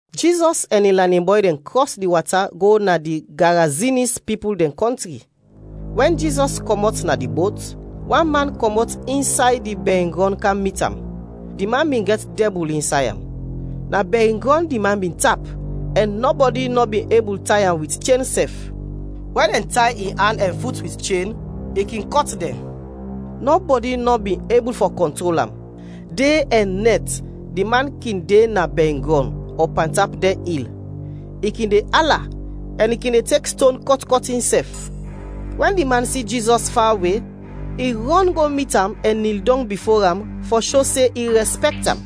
Jizɔs ɛn in lanin bɔy dɛn krɔs di wata go na di Garazinis pipul dɛn kɔntri. Wɛn Jizɔs kɔmɔt na di bot, wan man kɔmɔt insay di bɛringrɔn kam mit am. Di man bin gɛt dɛbul insay am. Na bɛringrɔn di man bin tap ɛn nɔbɔdi nɔ bin ebul tay am wit chen sɛf. Wɛn dɛn tay in an ɛn fut wit chen, i kin kɔt dɛn. Nɔbɔdi nɔ bin ebul fɔ kɔntrol am. De ɛn nɛt di man kin de na bɛringrɔn ɔ pantap dɛn il. I kin de ala ɛn i kin de tek ston kɔt kɔt insɛf. Wɛn di man si Jizɔs fawe, i rɔn go mit am ɛn nil dɔng bifo am fɔ sho se i rɛspɛkt am.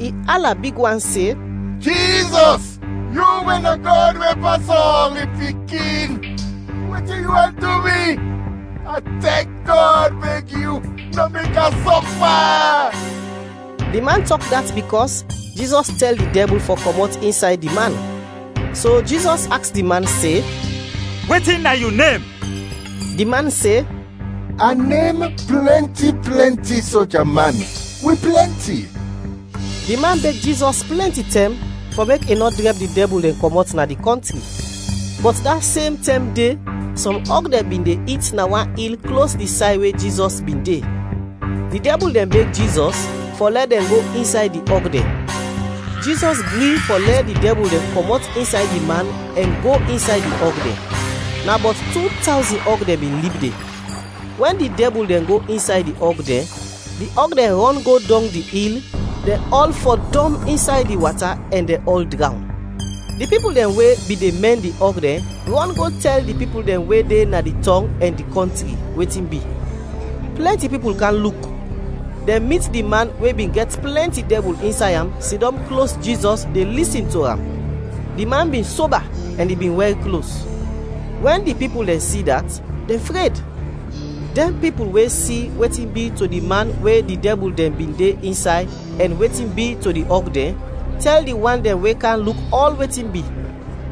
I ala big wan se, “Jizɔs, yu we na Gɔd we pas ɔl, in Pikin, wetin yu want du mi? A tek Gɔd beg yu, nɔ mek a sɔfa!” Di man tɔk dat bikɔs Jizɔs tɛl di dɛbul fɔ kɔmɔt insay di man. So Jizɔs aks di man se, “Wetin na yu nem?” Di man se, “A nem ‘Plɛnti plɛnti Soja man,’ wi plɛnti!” Di man beg Jizɔs plɛnti tɛm fɔ mek i nɔ drɛb di dɛbul dɛn kɔmɔt na di kɔntri. Bɔt da sem tɛm de sɔm ɔg dɛn bin de it na wan il klos di say we Jizɔs bin de. Di dɛbul dɛn beg Jizɔs fɔ lɛ dɛn go insay di ɔg dɛn. Jizɔs gri fɔ lɛ di dɛbul dɛn kɔmɔt insay di man ɛn go insay di ɔg dɛn. Na bɔt tu tawzin ɔg dɛn bin lib de. Wɛn di dɛbul dɛn go insay di ɔg dɛn, di ɔg dɛn rɔn go dɔng di il, dɛn ɔl fɔdɔm insay di wata ɛn dɛn ɔl drawn. Di pipul dɛn we bin de mɛn di ɔg dɛn rɔn go tɛl di pipul dɛn we de na di tɔng ɛn di kɔntri, wetin bi. Plɛnti pipul kam luk. Dɛn mit di man we bin gɛt plɛnti dɛbul insay am sidɔm klos Jizɔs de lisin to am. Di man bin soba ɛn i bin wɛr klos. Wɛn di pipul dɛn si dat, dɛn fred. Dɛn pipul we si wetin bi to di man we di dɛbul dɛn bin de insay ɛn wetin bi to di ɔg dɛn, tɛl di wan dɛn we kam luk ɔl wetin bi.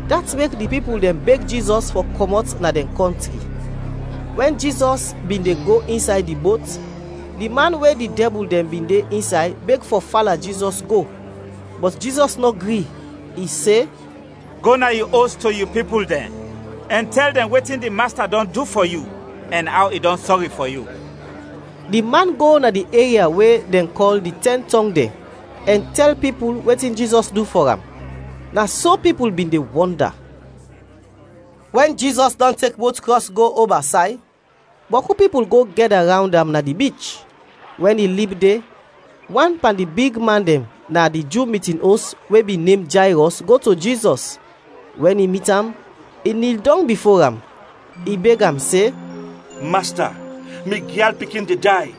Dat mek di pipul dɛn beg Jizɔs fɔ kɔmɔt na dɛn kɔntri. Wɛn Jizɔs bin de go insay di bot, di man we di dɛbul dɛn bin de insay beg fɔ fala Jizɔs go. Bɔt Jizɔs nɔ gri, i se, “Go na yu os to yu pipul dɛn, ɛn tɛl dɛn wetin di Masta dɔn du fɔ yu ɛn aw i dɔn sɔri fɔ yu.” Di man go na di eria we dɛn kɔl di Tɛn Tɔng dɛn ɛn tɛl pipul wetin Jizɔs du fɔ am. Na so pipul bin de wɔnda. Wɛn Jizɔs dɔn tek bot krɔs go oba say, bɔku pipul go gɛda rawnd am na di bich. Wɛn i lib de wan pan di bigman dɛn na di Ju mitin os we bin nem Jayrɔs go to Jizɔs; wɛn i mit am, i nil dɔng bifo am. I beg am se, “Masta, mi gyal pikin de day,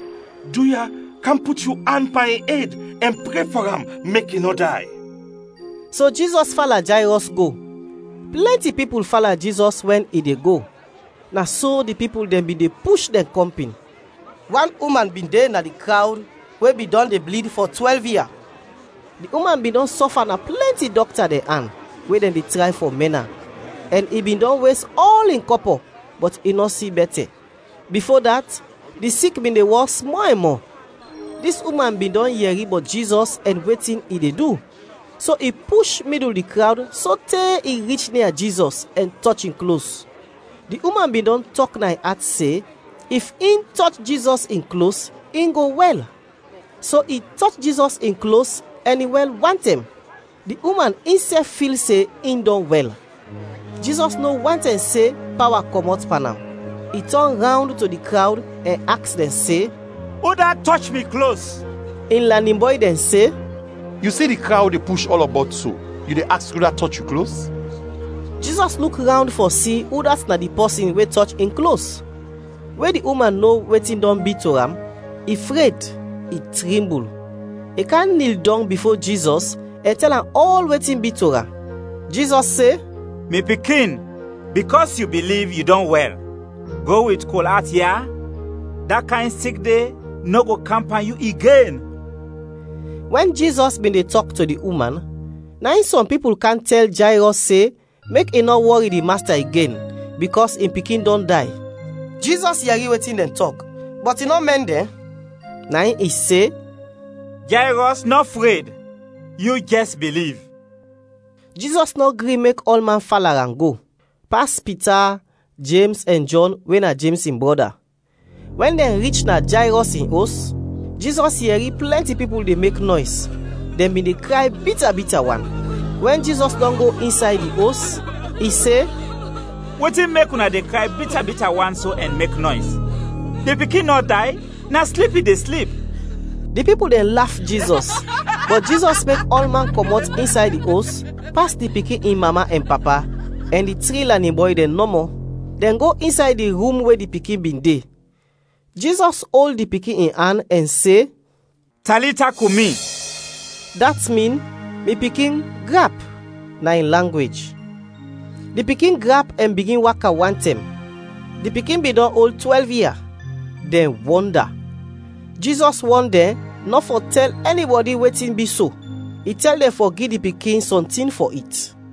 duya, kam put yu an pan in ed ɛn pre fɔ am mek i nɔ day.” So Jizɔs fala Jayrɔs go; plɛnti pipul fala Jizɔs wɛn i de go, na so di pipul dɛn bin de push dɛn kɔmpin. Wan uman bin de na di krawd we bin dɔn de blid fɔ twɛlv ia. Di uman bin dɔn sɔfa na plɛnti dɔkta dɛn an we dɛn de tray fɔ mɛn am, ɛn i bin dɔn wes ɔl in kɔpɔ, bɔt i nɔ si bɛtɛ. Bifo dat di sik bin de wɔs mɔ ɛn mɔ. Dis uman bin dɔn yɛri bɔt Jizɔs ɛn wetin i de du, so i push midul di krawd sote i rich nia Jizɔs ɛn tɔch in klos. Di uman bin dɔn tɔk na in at se, if in tɔch Jizɔs in klos, in go wɛl. So i tɔch Jizɔs in klos ɛn i wɛl wantɛm. Di uman insɛf fil se in dɔn wɛl. Jizɔs no wantɛm se pawa kɔmɔt pan am, i tɔn rawnd to di krawd ɛn aks dɛn se, “Udat tɔch mi klos?” In lanin bɔy dɛn se, “Yu si di krawd de push ɔlɔbɔt so, yu de aks udat tɔch yu klos?” Jizɔs luk rawnd fɔ si udat na di pɔsin we tɔch in klos. We di uman no wetin dɔn bi to am, i fred, i trimbul. I kam nil dɔng bifo Jizɔs ɛn tɛl am ɔl wetin bi to am. Jizɔs se, “Mi pikin, bikɔs yu biliv, yu dɔn wɛl, go wit kol at ya, da kayn sik de nɔ go kam pan yu igen.” Wɛn Jizɔs bin de tɔk to di uman, na in sɔm pipul kam tɛl Jayrɔs se mek i nɔ wɔri di Masta igen, bikɔs in pikin dɔn day. Jizɔs yɛri wetin dɛn tɔk, bɔt i nɔ mɛn dɛn. Na in i se, “Jayrɔs, nɔ fred, yu jɛs biliv.” Jizɔs nɔ gri mek ɔlman fala am go, pas Pita, Jems ɛn Jɔn we na Jems in brɔda. Wɛn dɛn rich na Jayrɔs in os, Jizɔs yɛri plɛnti pipul de mek nɔys, dɛn bin de kray bita bita wan. Wɛn Jizɔs dɔn go insay di os, i se, “Wetin mek una de kray bita bita wan so ɛn mek nɔys? Di pikin nɔ day, na slip i de slip.” Di pipul dɛn laf Jizɔs. Bɔt Jizɔs mek ɔlman kɔmɔt insay di os, pas di pikin in mama ɛn papa, ɛn di tri lanin bɔy dɛn nɔmɔ. Dɛn go insay di rum we di pikin bin de. Jizɔs ol di pikin in an ɛn se, “Talita kumi” dat min, “Mi pikin, grap!” na in langwej. Di pikin grap ɛn bigin waka wantɛm. (Di pikin bin dɔn ol twɛlv ia). Dɛn wɔnda! Jizɔs wɔn dɛn nɔ fɔ tɛl ɛnibɔdi wetin bi so. I tɛl dɛn fɔ gi di pikin sɔntin fɔ it.